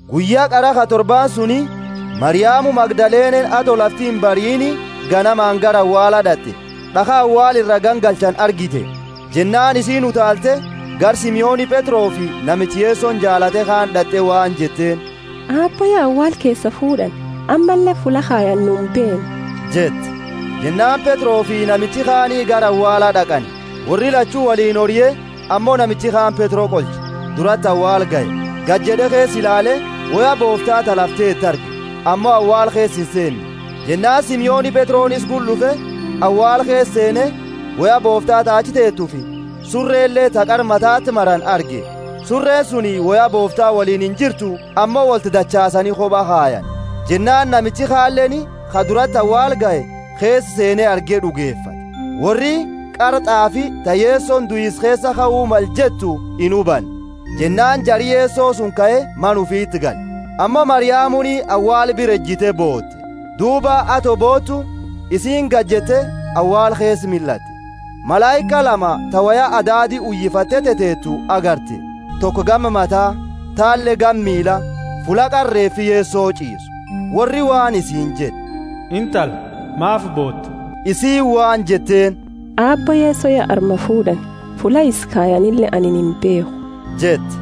Guyya qara ka torbaani suni, Mariamu Magdalene, ato lafti imbariini, ganamaani gara awaala d'at'e, d'akha awaala ira gangalchani argite. Jennaani isiini utaalte, gara Simoni Petrofi namicha Yesoni jaalate kaani d'at'e waan jetteeni, Aabbo ya awaala keesaa fuud'ani, ammalle fulla kayani nu imbeennu jette. Jennaani Petrofi namichi kaani gara awaala d'aqani. Worri lachu woliini orie, ammo namichi kaani Petro qolche, durati awaala gahe. Gajed'e, keesa ilaale, woya boofta ta lafa teetu arge, ammo awaala keesa inseenne. Jennaani Simoni Petroni isa gula d'ufe, awaala keesa seene, woya boofta ta achi teetufi. Surele ta qara matati marani arge. Sureni suni woya boofta woliini injirtu ammo wolti dachaasani koba kayani. Jennaani namichi kaleeni, ka durati awaala gahe, keesa seene arge d'ugefate. Worri qara t'aafi, ta Yesoni duisa keesaa kau male jettu inhubanne. Jennaani jari Yeso suni kae mana ufiti gale. Ammo Mariamuni awaala bira ejite boote. Duuba ato bootu, isiini gajette awaala keesa millatte, malaika lama ta woya adaadi uyifatte teteetu agarte, toko gama mata, taleeni gama miila, fulla qara reefi Yeso ch'iisu. Worri waan isiini jed'e, Intala, maafi boota? Isiini waan jetteeni, Aabbo Yeso ya armaa fuud'ani, fulla isa kayanile anini imbeekhu jette.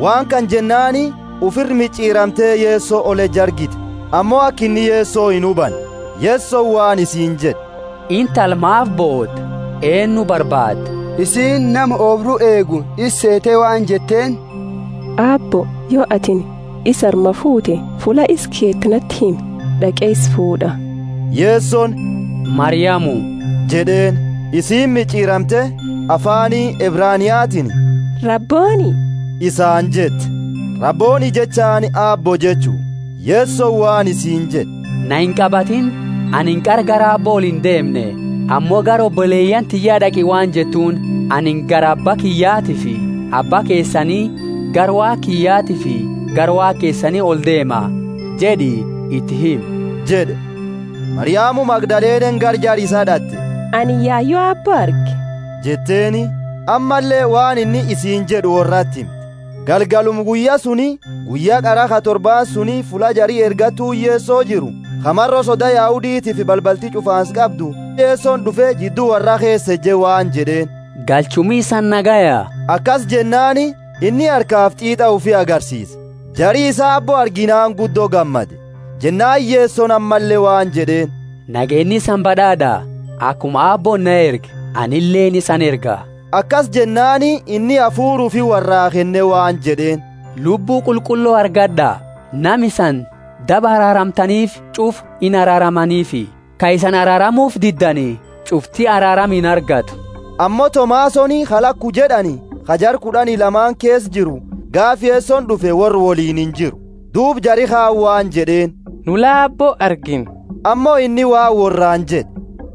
Waan kana jennaani ufira mich'iramte Yeso oleju argite; ammo aka inni Yeso inhubanne. Yesoni waan isiini jed'e, Intala, maafi boota? Eennu barbaadda? Isiini nama oobru eegu isa seete waan jetteeni, Aabbo, yo atini isa armaa fuute, fulla isa keete nati himi, d'aqe isa fuud'a. Yesoni, Mariamu! jed'eeni. Isiini mich'iramte, afaani Ebraniatiini, Rabboni! isaani jette. (Rabboni jechaani Aabbo jechu.) Yesoni waan isiini jed'e, Naa inqabatini, anini qara gara Aabbo olindeemne. Ammo gara oboleyaani tiyya d'aqi waan jettuuni, Anini gara Abba kiyyatiifi Abba keesani, gara Waaqa kiyyatiifi gara Waaqa keesani oldeema, jed'i iti himi jed'e. Mariamu Magdalene gara jara isaa d'at'e, Anini yayu Aabbo arge jetteeni, ammalle waan inni isiini jed'e worrati himte. Galgaluma guyya suni, guyya qara ka torbaani suni fulla jari ergattuuni Yeso jiru ka maro soda Yahuditiifi balbalti ch'ufaansa qaabdu Yesoni d'ufe, jiddu worra keesa eje waan jed'eeni galchuumi isani nagayaa? Akasi jennaani, inni harkafi t'iit'a ufi agarsiise. Jari isaa Aabbo arginaani guddo gammade. Jennaani Yesoni ammalle waan jed'eeni, Nageenni isani bad'aad'a? Akuma Aabbooni na erge anileeni isani erga. Akasi jennaani, inni hafuura ufi worraa kenne waan jed'eeni, Lubbu Qulqullo argad'a. Nama isani daba araaramtaniifi ch'ufa inaraaramaniifi; ka isani araaramufi diddani ch'ufti araarama inargatu. Ammo Tomasoni ka laku jed'ani ka jara kud'ani lamaani keesa jiru gaafa Yesoni d'ufe, worra woliini injiru. Duuba jari kaani waan jed'eeni, Nu la Aabbo argine. Ammo inni waan worraani jed'e,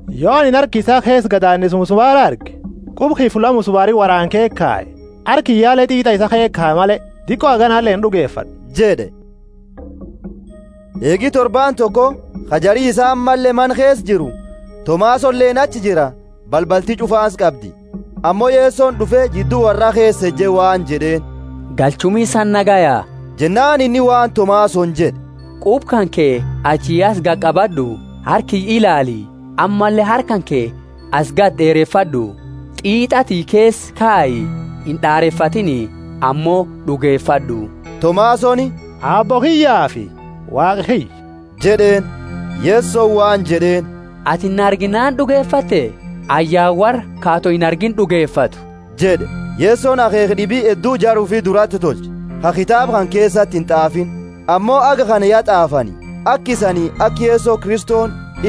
Yo anini harka isaa keesa gadaanisa musumaraa arge, quba kiyya fulla musumaraani woraane ke kaye, harka kiyyale t'iit'a isaa keesa kaye male, diqo haganale ind'ugefad'u jed'e. Eegi torbaani toko, ka jari isaa ammalle mana keesa jiru, Tomasoleeni achi jira. Balbalti ch'ufaansa qabdi, ammo Yesoni d'ufe, jiddu worraa keesa eje waan jed'eeni, Galchuumi isani nagaya? Jennaani inni waan Tomasoni jed'e, Quba kanke achi asi gaqabad'u, harka kiyya ilaali; ammalle harka kanke asi gadi d'eerefad'u, t'iit'a tiyya keesa kayi. Ind'areefatiini, ammo d'ugefad'u! Tomasoni, Aabbo kiyyafi Waaqa kiyya! jed'eeni. Yesoni waan jed'eeni, Atini na arginaani d'ugefatte? Ayyaana worra ka ato inargiini d'ugefatu jed'e. Yesoni akheekha d'ibi heddu jara ufi durati tolche, ka kitaaba kana keesati int'aafini. Ammo haga kana ya t'aafani, aka isani aka Yesoni Kristo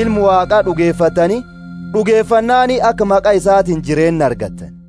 Ilma Waaqa d'ugefattani, d'ugefannaani aka maqa isatiini jireenna argattani.